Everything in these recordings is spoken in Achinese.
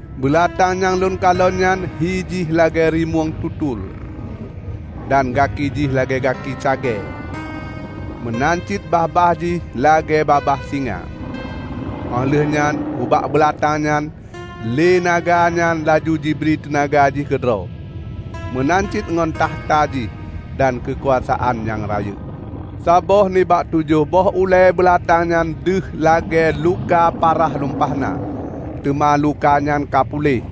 Beulatang nyang lôn kalon nyan hi jih lagée rimueng tutul, dan gaki jih lagée gaki cagée, meunan cit babah jih lagée babah singa. Óh lheueh nyan ubak beulatang nyan lé naga nyan laju jibri teunaga jih keudroe, meunan cit ngon takhta jih dan keukuasaan nyang rayeuk. Saboh nibak tujoh boh ulée beulatang nyan deuh lagée luka parah lumpah na, teuma luka nyan ka puléh.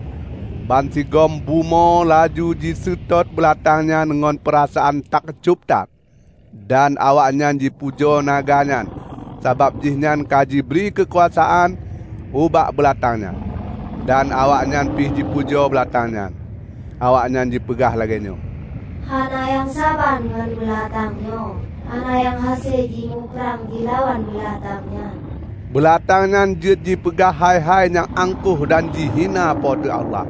Bansigom bumoe laju jiseutôt beulatang nyan ngon peurasaan takjob that. Dan awaknyan jipujoe naga nyan sabab jihnyan ka jibri keukuasaan ubak beulatang nyan. Dan awaknyan pih jipujoe beulatang nyan. Awaknyan jipeugah lagée nyoe, "Hana nyang saban ngon beulatang nyoe! Hana nyang hase jimuprang jilawan beulatang nyan!" Beulatang nyan jeuet jipeugah hai-hai nyang angkoh dan jihina Po teu Allah.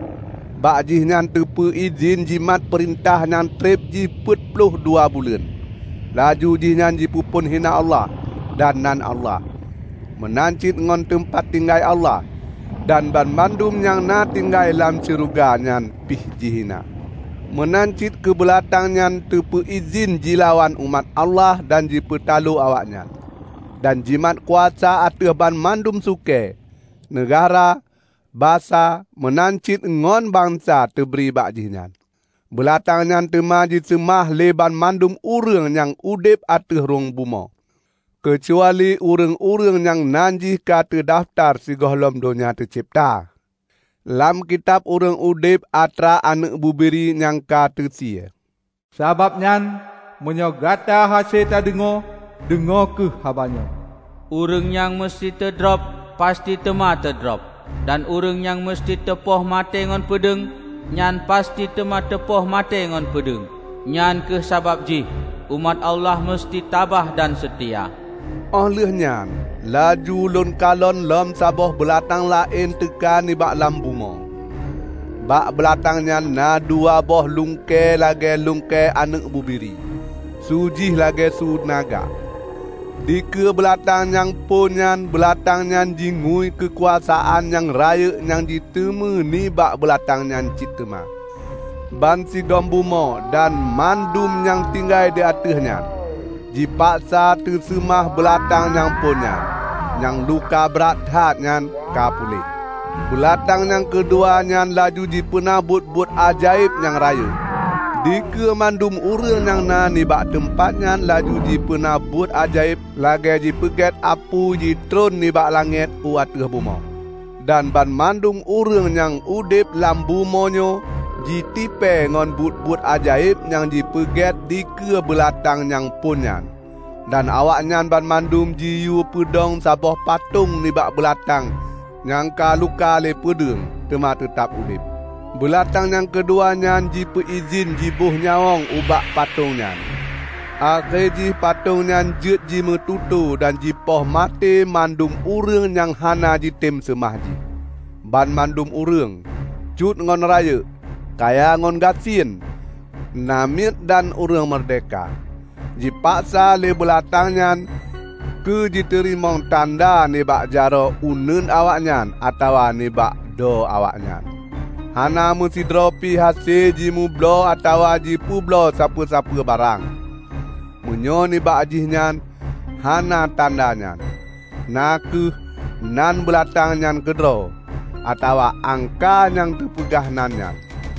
Bak jihnyan teupeu idhin jimat peurintah nyang treb jih peuet ploh dua buleuen. Laju jihnyan jipeuphon hina Allah, dan nan Allah. Meunan cit ngon teumpat tinggai Allah, dan banmandum nyang na tinggai lam syeuruga nyan pih jihina. Meunan cit keu beulatang nyan teupeu idhin jilawan umat Allah dan jipeutaloe awaknyan. Dan jimat kuasa ateueh banmandum sukée, neugahra, basa, meunan cit ngon bansa teubri bak jihnyan. Beulatang nyan teuma jiseumah lé banmandum ureuëng nyang udeb ateueh rhueng bumoe, keucuali ureuëng-ureuëng nyang nan jih ka teudafeutar sigohlom donya teucebta, lam kitab ureuëng udeb atra Aneuëk Bubiri nyang ka teusie. Sabab nyan, meunyoe gata hase tadeungoe, deungoe kheueh haba nyoe: "Ureuëng nyang meuseuti teudrob, pasti teuma teudrob. Dan ureuëng nyang meuseuti teupoh maté ngon peudeueng, nyan pasti teuma teupoh maté ngon peudeueng. Nyang kheueh sabab jih umat Allah meuseuti tabah dan seutia." Óh lheueh nyan laju lôn kalon lom saboh beulatang laén teuka nibak lam bumoe. Bak beulatang nyan na dua boh lungkée lagée lungkée aneuëk bubiri. Su jih lagée su naga. Dikeue beulatang nyang phon nyan beulatang nyan jingui keukuasaan nyang rayeuk nyang jiteumé nibak beulatang nyan cit teuma. Bansigom bumoe dan mandum nyang tinggai di ateueh nyan, jipaksa teuseumah beulatang nyang phon nyan, nyang luka brat that nyan ka puléh. Beulatang nyang keudua nyan laju jipeuna buet-buet ajaéb nyang rayeuk. Dikeue mandum ureuëng nyang na nibak teumpat nyan laju jipeuna buet ajaéb lagée jipeugét apui jitreun nibak langét u ateueh bumoe. Dan banmandum ureuëng nyang udeb lam bumoe nyoe jitipée ngon buet-buet ajaéb nyang jipeugét dikeue beulatang nyang phon nyan. Dan awaknyan banmandum jiyue peudong saboh patong nibak beulatang nyang ka luka lé peudeueng, teuma teutab udeb. Beulatang nyang keudua nyan jipeu idhin jiboh nyawöng ubak patong nyan, akhé jih patong nyan jeuet jimeututoe dan jipoh maté mandum ureuëng nyang hana jitem seumah jih. Banmandum ureuëng, cut ngon rayeuk, kaya ngon gasien, namiet dan ureuëng meurdehka, jipaksa lé beulatang nyan keujiteurimong tanda nibak jaroe uneuen awaknyan atawa nibak dho awaknyan. Hana meusidroepi hase jimeubloe atawa jipeubloe sapeue-sapeue barang, meunyoe nibak jihnyan hana tanda nyan, na kheueh nan beulatang nyan keudroe, atawa angka nyang teupeugah nan nyan.